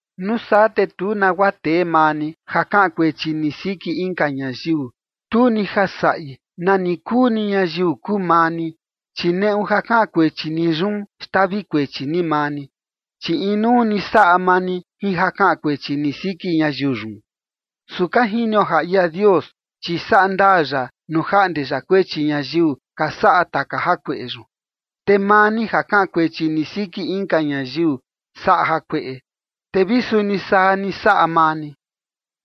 Nuu saa te tu nagua tee maa ni ja kaꞌan kuechi ni siki inka ñayiu, tu ni ja saꞌi nani kuu ni ñayiu kuu maa ni, chi neꞌu ja kaꞌan kuechi ni yun, xtavi kuechi ni maa ni, chi inuu ni saꞌa maa ni jin ja kaꞌan kuechi ni siki ñayiu yun. Su ka jinio ja ia Dios, chi saꞌa ndaa ya nuu jaꞌnde ya kuechi ñayiu ka saꞌa taka jakueꞌe yun. Te maa ni, ja kaꞌan kuechi ni siki inka ñayiu saꞌa jakueꞌe, te vi suni saa ni saꞌa maa ni,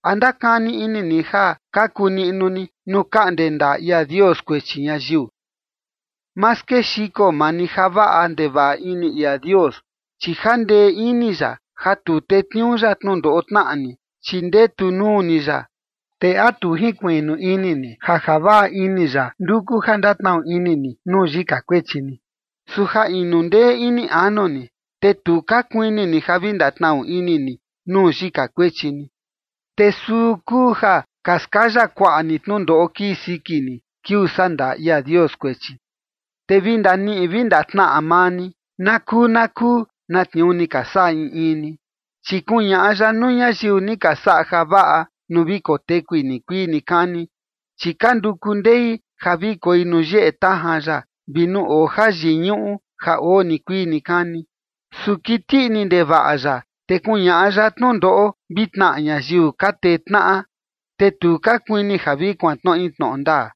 ¿a ndakani ini ni ja kaku niꞌnu ni nuu kaꞌnde ndaa ia Dios kuechi ñayiu? Ma skexiko maa ni javaꞌa ndevaꞌa ini ia Dios, chi jandee ini ya ja tu tetniuu ya tnundoꞌo tnaꞌa ni, chi ndetu nuu ni ya. ¿Te a tu jinkuiꞌnu ini ni ja javaꞌa ini ya nduku ja ndatnaꞌu ini ni nuu yika kuechi ni? Su ja inu ndee ini anu ni, te tu ka kuini ni ja vi ndatnaꞌu ini ni nuu yika kuechi ni. Te suu kuu ja ka skaya kuaꞌa ni tnundoꞌo kii siki ni, kiuu sandaa ia Dios kuechi. Te vi ndaniꞌi vi ndatnaꞌa maa ni na kuu na kuu na tniuu ni ka saꞌa in in ni. Chi kuñaꞌa ya nuu ñayiu ni ka saꞌa javaꞌa nuu vi kotekui nikuii nikani, chi ka nduku ndei ja vi koi nuu yeꞌe tajan ya vi nuu oo jayiñuꞌu ja oo nikuii nikani. Su kiti ini ndevaꞌa ya, te kuñaꞌa ya tnundoꞌo vi tnaꞌa ñayiu ka tee tnaꞌa, te tu ka kuini vi kuantnoꞌi tnoꞌo ndaa,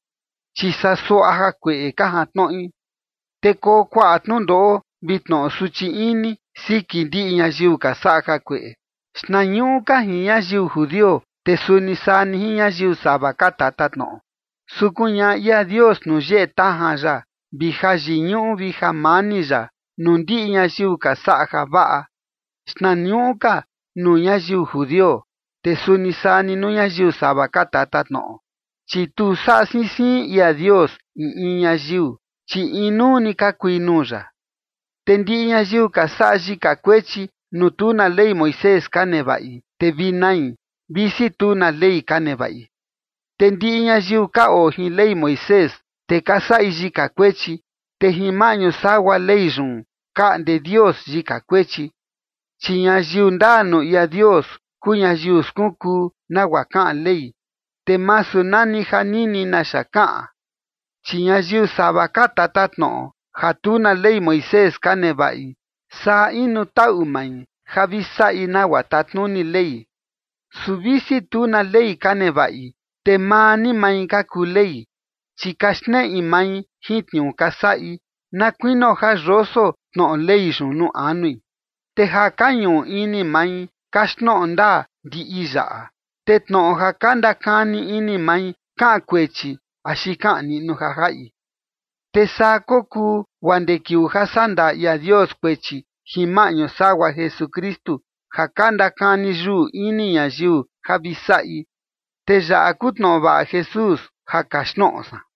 chi saa suaꞌa jakueꞌe ka jantnoꞌi. Te koo kuaꞌa tnundoꞌo vi tnoꞌo suchi ini siki ndiꞌi ñayiu ka saꞌa jakueꞌe, xtnañuꞌu ka jin ñayiu judio, te suni saa ni jin ñayiu sava ka tatatnoꞌo. Su kuñaꞌa ia Dios nuu yeꞌe tajan ya vi jayiñuꞌu vi jamani ya nuu ndiꞌi ñayiu ka saꞌa javaꞌa, xtnañuꞌu ka nuu ñayiu judio, te suni saa ni nuu ñayiu sava ka tatatnoꞌo. Chi tu saꞌa siin siin ia Dios in in ñayiu, chi inuu ni ka kui nuu ya. Te ndiꞌi ñayiu ka saꞌa yika kuechi, nuu tu na Ley Moisés ka nevaꞌi, te vi nai, visi tu na ley ka nevaꞌi. Te ndiꞌi ñayiu ka oo jin Ley Moisés, te ka saꞌi yika kuechi, te jin maꞌñu sagua Ley yun kaꞌnde Dios yika kuechi. Chi ñayiu ndaa nuu ia Dios kuu ñayiu skunkuu nagua kaꞌan Ley, te masu nani ja nini naxa kaꞌan. Chi ñayiu sava ka tatatnoꞌo ja tu na Ley Moisés ka nevaꞌi, saa inu taꞌu mai ja vi saꞌi nagua tatnuni Ley, su visi tu na Ley ka nevaꞌi, te maa ni mai ka kuu ley. Chi ka xneꞌi mai jin tniuu ka saꞌi, na kuinio ja yoso tnoꞌo Ley yun nuu anui, te ja ka ñuꞌu ini mai kaxtnoꞌo ndaa ndiꞌi yaꞌa. Te tnoꞌo ja ka ndakani ini mai kaꞌan kuechi axi kaꞌan niꞌnu ja jaꞌi. Te saa kokuu guaa ndee kiuu ja saꞌa ndaa ia Dios kuechi jin maꞌñu sagua Jesukristu ja ka ndakani yuꞌu ini ñayiu ja vi saꞌi. Te yaꞌa kuu tnoꞌo vaꞌa Jesús ja kaxtnoꞌo san.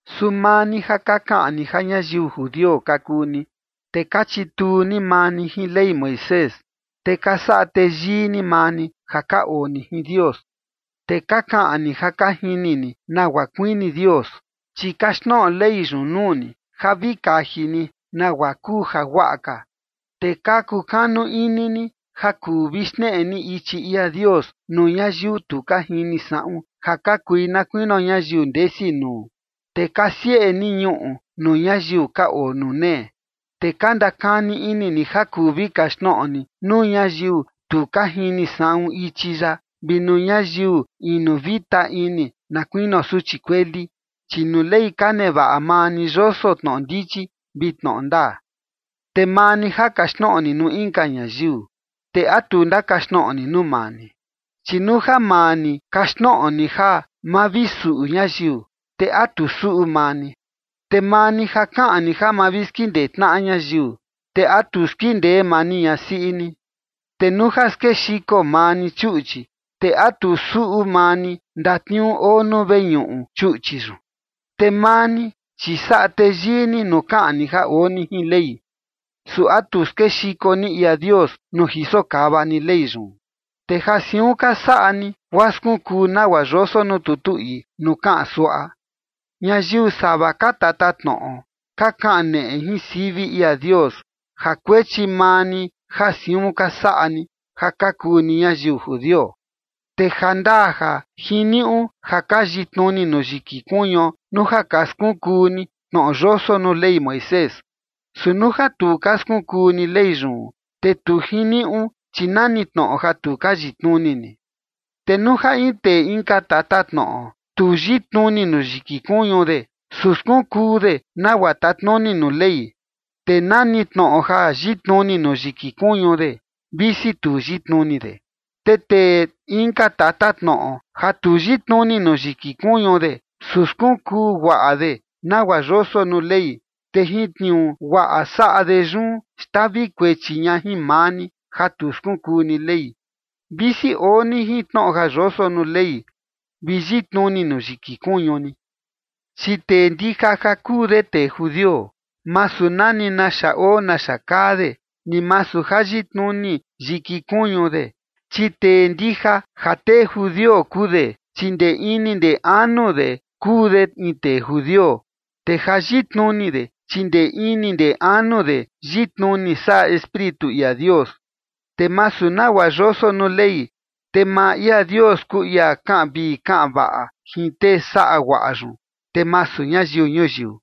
Su maa ni ja ka kaꞌan ni ja ñayiu judio ka kuu ni, te ka chituu ni maa ni jin Ley Moisés, te ka saꞌa teyii ni maa ni ja ka oo ni jin Dios, te ka kaꞌan ni ja ka jini ni nagua kuini Dios, chi kaxtnoꞌo Ley yun nuu ni ja vi kaji ni nagua kuu jaguaꞌa ka. Te ka kukanu ini ni ja kuu vi xneꞌe ni ichi ia Dios nuu ñayiu tu ka jini saꞌun ja ka kui na kuinio ñayiu ndesi nuu, te ka sieꞌe ni ñuꞌu nuu ñayiu ka oo nuu nee. Te ka ndakani ini ni ja kuu vi kaxtnoꞌo ni nuu ñayiu tu ka jini saꞌun ichi ya vi nuu ñayiu inu vita ini na kuinio suchi kueli, chi nuu Ley ka nevaꞌa maa ni yoso tnoꞌo ndichi vi tnoꞌo ndaa. Te maa ni ja kaxtnoꞌo ni nuu inka ñayiu, ¿te a tu ndakaxtnoꞌo ni nuu maa ni? Chi nuu ja maa ni kaxtnoꞌo ni ja ma vi suꞌu ñayiu, ¿te a tu suꞌu maa ni? Te maa ni ja kaꞌan ni ja ma vi skindee tnaꞌa ñayiu, ¿te a tu skindee maa ni ñasiꞌi ni? Te nuu ja skexiko maa ni chuꞌchi, ¿te a tu suꞌu maa ni ndatniuu oo nuu veñuꞌu chuꞌchi yun? Te maa ni, chi saꞌa teyii ni nuu kaꞌan ni ja oo ni jin Ley. ¿Su a tu skexiko ni ia Dios, nuu jisokava ni Ley yun? Te ja siun ka saꞌa ni, guaa skunkuu nagua yoso nuu tutu ii nuu kaꞌan suaꞌa: “Ñayiu sava ka tatatnoꞌo ka kaneꞌe jin sivi ia Dios ja kuechi maa ni ja siun ka saꞌa ni, ja ka kuu ni ñayiu judio”. Te jandaa ja jiniuꞌu ja ka yitnuni nuu yiki kuñuo nuu ja ka skunkuu ni tnoꞌo yoso nuu Ley Moisés. Su nuu ja tu ka skunkuu ni Ley yun, te tu jiniuꞌu, chi nani tnoꞌo ja tu ka yitnuni ni. Te nuu ja in tee inka tatatnoꞌo tu yitnuni nuu yiki kuñu de, su skunkuu de nagua tatnuni nuu Ley, te nani tnoꞌo ja yitnuni nuu yiki kuñu de, visi tu yitnuni de. Te tee inka tatatnoꞌo ja tu yitnuni nuu yiki kuñu de, su skunkuu guaꞌa de nagua yoso nuu Ley, te jin tniuu guaꞌa saꞌa de yun xtavi kuechi ña jin maa ni, ja tu skunkuu ni Ley, visi oo ni jin tnoꞌo ja yoso nuu Ley, vi yitnuni nuu yiki kuñu ni. Chi tee ndija ja kuu de tee judio, masu nani naxa oo naxa kaa de, ni masu ja yitnuni yiki kuñu de. Chi tee ndija ja tee judio kuu de, chi ndee ini ndee anu de kuu de in tee judio. Te ja yitnuni de, chi ndee ini ndee anu de yitnuni saꞌa Espíritu ia Dios, te masu nagua yoso nuu Ley. Te maa ia Dios kuu ia kaꞌan vii kaꞌan vaꞌa jin tee saꞌa guaꞌa yun, te masu ñayiu ñuyiu.